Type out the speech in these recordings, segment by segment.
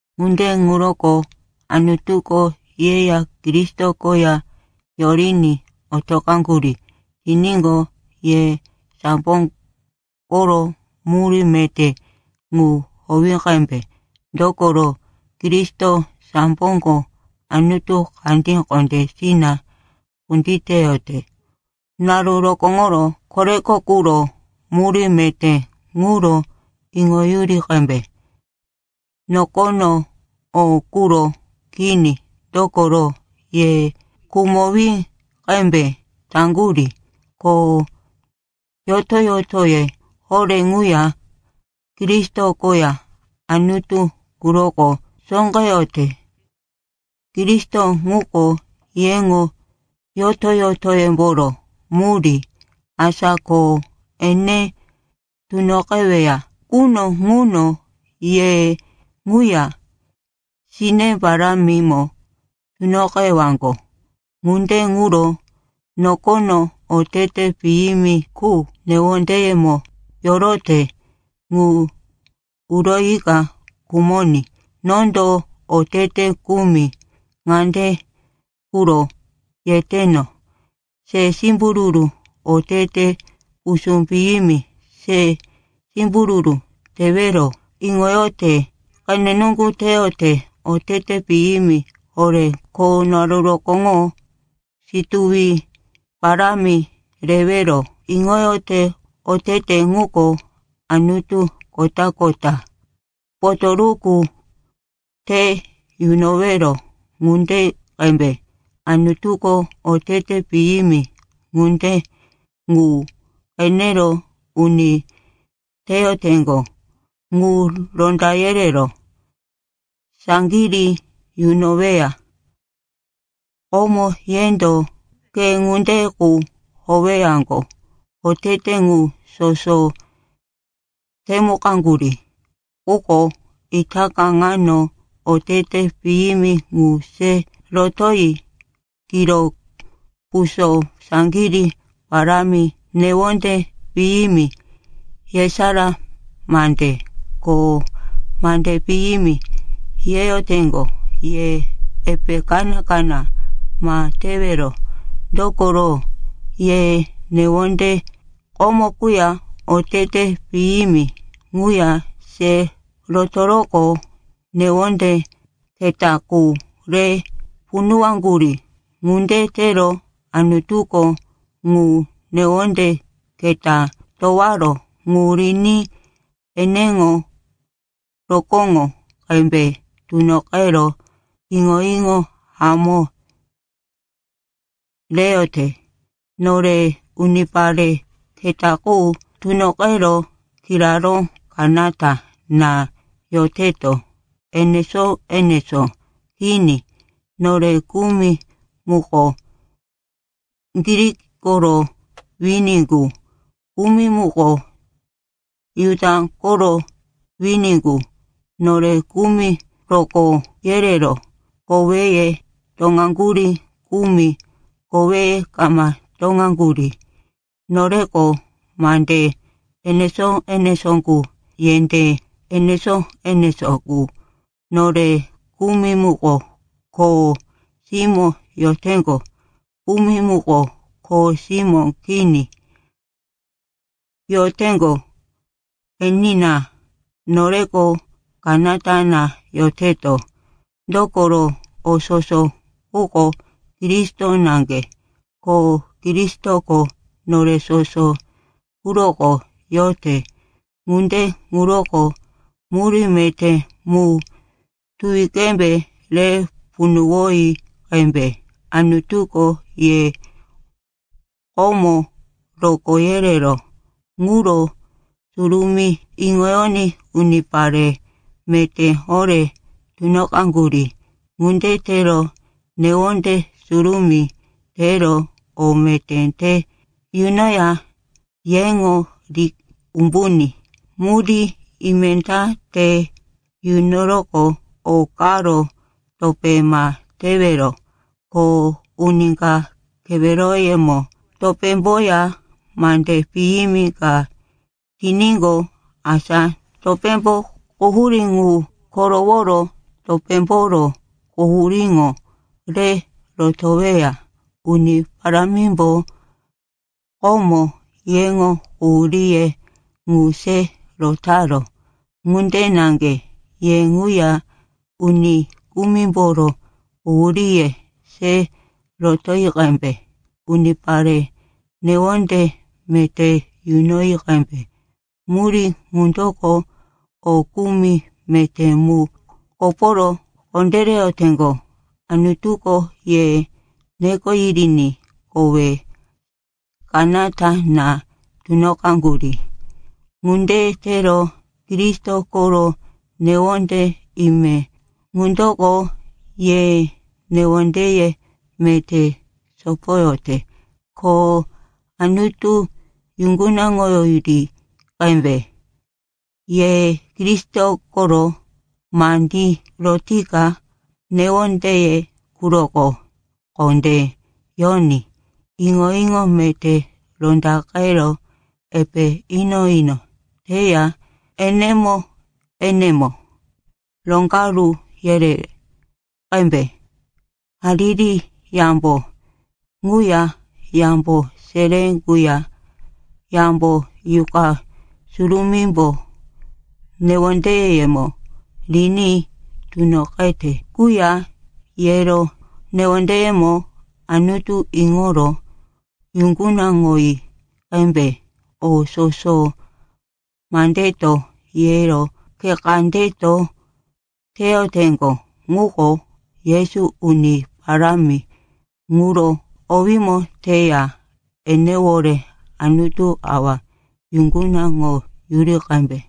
Ŋunde ŋuro Anutuko yeya Kristo koya yoriní otoqaŋgurí tiníqo, ye sambo koro murí meté ŋu howi qembe. Dokoro, Kristo samboko Anutu kandí kondésina kunditeyote. Naru rokóŋoro koreko quro murí meté ŋuro iŋoyuri qembe, nokono o quro kini. Dokoro ye khumowí qembe taŋgurí, ko yoto-yotoye horé ŋuya Kristo koya Anutu quroko sóqeyote. Kristo ŋuko yeŋo yoto-yotoyemboro murí. Asa ko ene tunoqeweya quno ŋuno ye ŋuya sine parámimo tunoqewaŋgo. Ŋunde ŋuro nokono otete piyimi qu newondeyemo yorote ŋu uroyika khumoní. Nondo otete kumi ŋande quro yeteno: se simbururu, otete pusú piyimi, se simbururu tewero iŋoyote, qene nuŋgu teyote, otete piyimi horé, ko naru rokóŋo situwi parámi rewero iŋoyote. Otete ŋuko anutu kota-kota potoruku te yunowero ŋunde qembe. Anutuko otete piyimi ŋunde ŋu qenero uni teyoteŋgo ŋu ronda yerero saŋgirí yunoweya. Komo yendo khe ŋunde qu howeyaŋgo, otete ŋu soso temukaŋgurí. Quko itaka ŋano otete piyimi ŋu se rotoyi: kiro puso, saŋgirí parámi, newonde piyimi, yesará mande, ko mande piyimi yeyoteŋgo. Ye epe kaná-kaná ma tewero, dokoro, ye newonde komo quya otete piyimi ŋuya se rotoroqo newonde keta qu re punuwaŋgurí. Ŋunde tero Anutuko ŋu newonde keta towaró ŋu riní eneŋo rokóŋo qembe tunoqero iŋo-iŋo hamó reyote. Nore unipare keta qu tunoqero kiraró kanata na yoteto, enesó-enesó kini. Nore kumi muko Grik koro wini qu, kumi muko Juda koro wini qu; nore kumi rokó yerero koweye toŋaŋgurí, kumi koweye kama toŋaŋgurí; noreko mande enesó-enesó qu, yendé enesó-enesó qu; nore kumi muko kho simó yoteŋgo, kumi muko kho simó kini yoteŋgo. Enina, noreko kanata na yoteto. Dokoro, o soso quko Kristo naŋge, ko Kristoko nore soso quroko yote. Ŋunde ŋuroko murí meté mu tuwi qembe re punuwoyi qembe. Anutuko ye komo rokó yerero ŋuro surumí iŋoyoní unipare meté horé tunoqaŋgurí. Ŋunde tero newonde surumí tero o meté te yunoya yeŋo ri umbuní murí ime ta te yunoro o karo topé ma tewero. Ko uni ka keweroyemo topémboya mande piyimi ka tiníqo, asa topémbo quhurí ŋu koroworo topémboro quhuríŋo re rotoweya. Uni Parámimbo komo yeŋo quhuríye ŋu se rotaró, ŋunde naŋge ye ŋuya uni kumimboro quhuríye se rotoyi qembe. Unipare newonde meté yunoyi qembe. Murí ŋundoko o kumi meté mu koporo kondéreyoteŋgo. Anutuko ye neko yiriní kowe kanata na tunoqaŋgurí. Ŋunde tero Kristo koro newonde ime ŋundoko ye newondeye meté sopoyote. Ko Anutu yuŋgunaŋoyuri qembe. Ye Kristo koro mandí rotika newondeye quroko kondé yoní. Iŋo-iŋo meté rondaqero epe ino-ino teya enemo-enemo roŋgaru yere qembe. Hariri yambo ŋuya yambo seré quya yambo Yuqa Surumímbo newondeyemo riní tunoqete quya yero newondeyemo Anutu iŋoro yuŋgunaŋoyi qembe. O soso mandeto yero khe kandeto teyoteŋgo ŋuko Yesu Uni Parámi ŋuro owímo teya enewore Anutu Awa yuŋgunaŋoyuri qembe.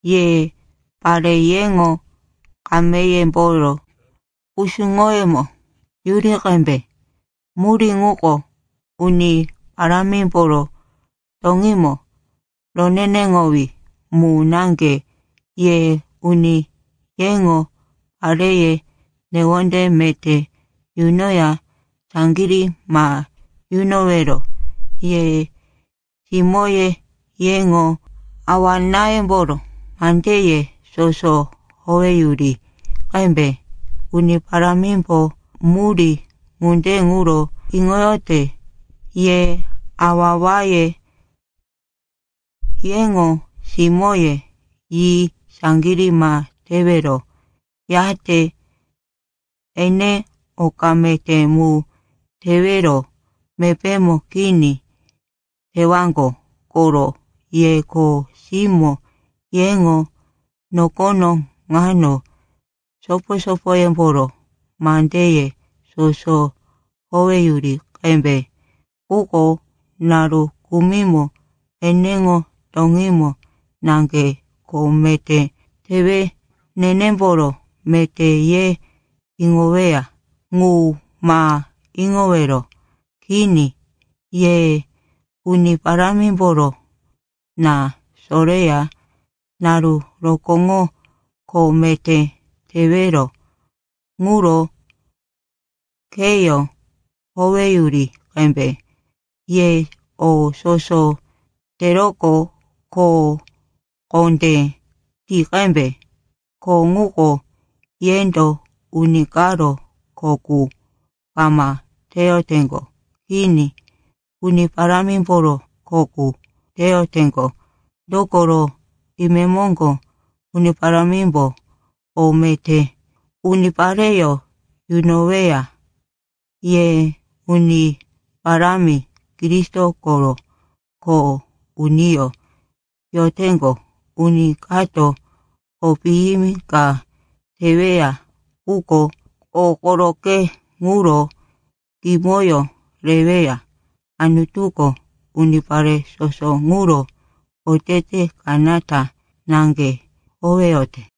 Ye pare, yeŋo kameyemboro kusuŋoyemo yuri qembe. Murí ŋuko Uni Parámimboro toŋímo roneneŋowí mu naŋge. Ye uni, yeŋo pareye newonde meté yunoya saŋgirí ma yunowero. Ye simóye, yeŋo awa-náyemboro mandeye soso howeyuri qembe. Uni Parámimbo murí ŋunde ŋuro iŋoyote. Ye awa-awaye, yeŋo simóye yi saŋgirí ma tewero, yate ene oka meté mu tewero mepémo kini tewaŋgo koro. Ye kho simó, yeŋo nokono ŋano sopo-sopoyemboro mandeye soso howeyuri qembe. Quko naru kumimo eneŋo toŋímo naŋge kho meté tewe nenemboro meté ye iŋoweya ŋu ma iŋowero. Kini. Ye Uni Parámimboro na soreya naru rokóŋo kho meté tewero ŋuro kheyó howeyuri qembe. Ye o soso teroqo kho kondé ti qembe. Kho ŋuko yendo uni karo kho qu kama teyoteŋgo. Kini. Uni Parámimboro kho qu teyoteŋgo. Dokoro imemoŋgo Uni Parámimbo o meté unipareyó yunoweya. Ye Uni Parámi Kristo koro kho uniyó yoteŋgo. Uni kato o piyimi ka teweya quko o koroqe ŋuro kimoyó reweya. Anutuko unipare soso ŋuro otete kanata naŋge howeyote.